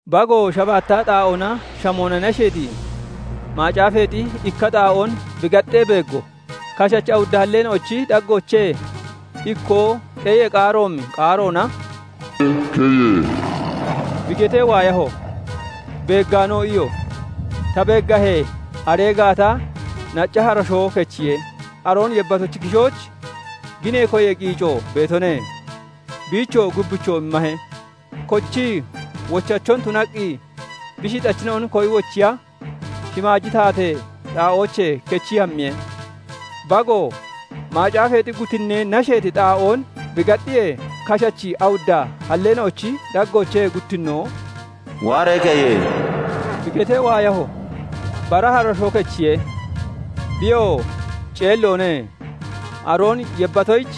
Bagoo shabaatta xaa'oona shamoona nasheeti macaafeexi ikka xaa'oon bi gaxxee beeggo; kashachi awudda halleena'ochi daggoochee ikkoo xeeyee qaaroomi qaaroona "Waaree keye!" bi getee waayaho; beeggaanoo iyo; ta beeggahee, aree gaata nacca harashoo kechiye; aroon yebbatochi kishooch ginee koyee qiico beetone; biichoo gubbichoo immahe; kochii wochachon tunaqqi bi shixachina'on koyi wochiya shimaaji taatee xaa'oochee kechii hammiye. Bagoo macaafeexi guttinnee nasheeti xaa'oon bi gaxxiyee, kashachi awudda halleena'ochi daggoochee guttinnoo "Waaree keye!" bi getee waayaho. Bara harashoo kechiye; biyoo ceelloone; aroon yebbatoyich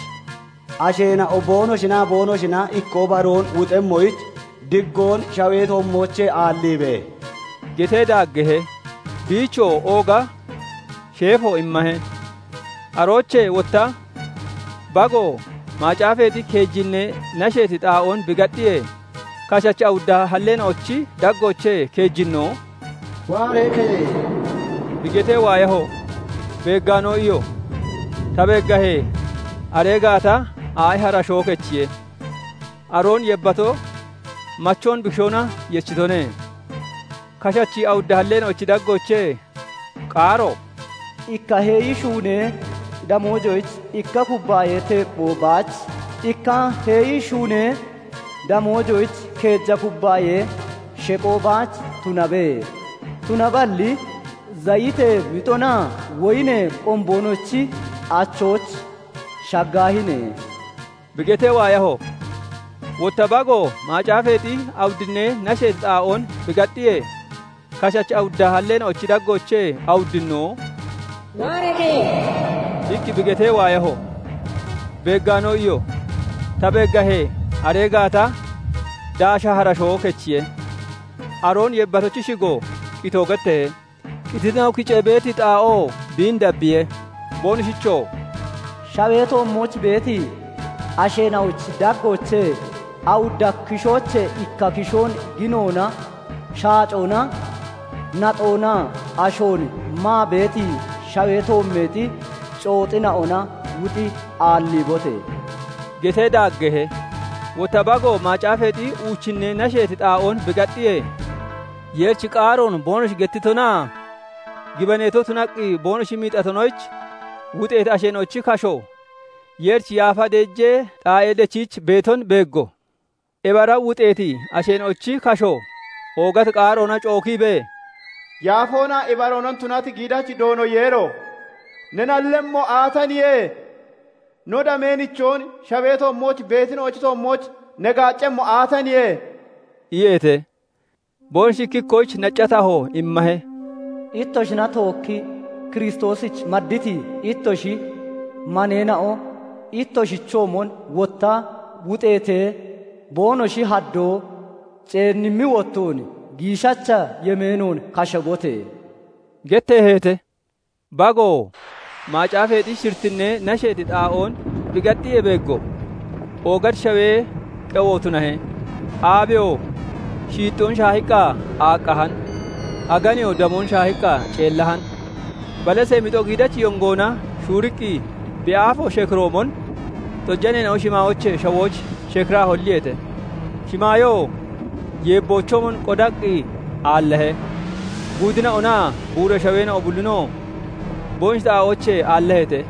"Asheena'o boonoshinaa boonoshina ikkoo baroon wuxemmoyich diggoon shawee toommoochee aalliibe!" getee daaggeehe; biichoo ooga sheefo immahe. Aroochee wotta Bago macaafeexi keejinnee nasheeti xaa'oon bi gaxxiyee, kashachi awudda halleena'ochi daggoochee keejinnoo "Waaree keye!" bi getee waayaho; beeggaanoo iyo; ta beeggahee, aree gaata aa'i harashoo kechiye; aroon yebbato machoon bi kishoona yechitone. Kashachi awudda halleena'ochi daggoochee qaaro "Ikka heeyi shuunee damoojoyich ikka kubbaayee teepphoo baach, ikka heeyi shuunee damoojoyich keeja kubbaayee sheqoo baach tunabe; tunaballi zayitee mixonaa woyinee qomboonochi achooch shaggaahine!" bi getee waayaho. Wotta Bago macaafeexi awuddinnee nasheeti xaa'oon bi gaxxiyee, kashachi awudda halleena'ochi daggoochee awuddinnoo "Waaree keye!" iqqi bi getee waayaho; beeggaanoo iyo; ta beeggahee, aree gaata daasha harashoo kechiye; aroon yebbatochi shigo qitoo getteehe; qititina'o kicee beeti xaa'oo biin dabbiye. Boonoshichoo "Shawee toommooch beeti asheena'ochi daggoochee awudda kishoochee ikka kishoon ginoona, shaacoona, naxoonaa ashoon maa beeti shawee toommeexi cooxina'ona wuxi aalliibote!" getee daaggeehe. Wotta Bago macaafeexi uuchinnee nasheeti xaa'oon bi gaxxiyee, Yeerichi qaaroon boonoshi gettitonaa gibaneeto tunaqqi boonoshi miixatonoyich wuxeeti asheena'ochi kasho Yeerichi yaafa deejee xaa'ee dechiich beeton beeggo. Ebi ara wuxeeti asheena'ochi kasho oogati qaaroona cookiibee, "Yaafoonaa ibaroona tunati giidachi Doono Yeero! Ne nallemmo aataniye? No damee nichoon shawee toommooch beetina'ochi toommooch ne gaaccemmo aataniye?" iyeete. Boonoshi ikki ikkoyich nacca taho immahe; "Ittoshina tookkii Kiristoosich madditi ittoshi maneena'o ittoshichoomon wotta wuxeetee boonoshi haddoo ceennimmi wottoon, giishacha yemeenoon kashabote!" getteeheete. Bagoo macaafeexi shirittinnee nasheeti xaa'oon bi gaxxiyee beeggo; oogati shawee qewo tunahe; aabeyoo shiixxoon shaahiqqa aaqqahan; aganeyoo damoon shaahii ceellahan; balasee mixo giidachi yongoona shuuriqqi bi aafo shekiroomon, xojaneena'o shimaayoochee shawooch shekiraa holliyeete; shimaayoo yeebboochoomon qodaqqi aallahe; guudina'onaa buura shaweena'o bullinoo boonoshi xaa'oochee aallaheete.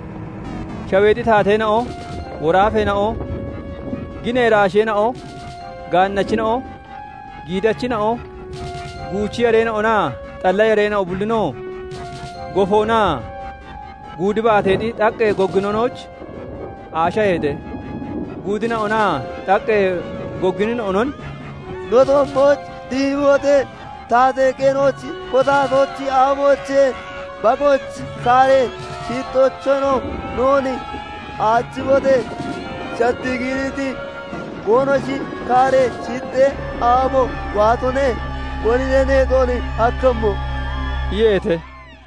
Shaweexi taateena'o, woraafeena'o, ginee iraasheena'o, gaannachina'o, giidachina'o, guuchi yareena'onaa xalla yareena'o bullinoo gofoonaa guudi baateexi xaqqee gogginonooch aashaheete. Guudina'onaa xaqqee gogginina'onon "No toommooch dihibote! Taatee qeenooch kotatochi aafoochee, Bagoochi kaaree shiixxoocheenoo noon aachibote! Shattii giiriiti boonoshi kaaree shiixxee aabo waatone; konine neexoon hakkemmo?" iyeete.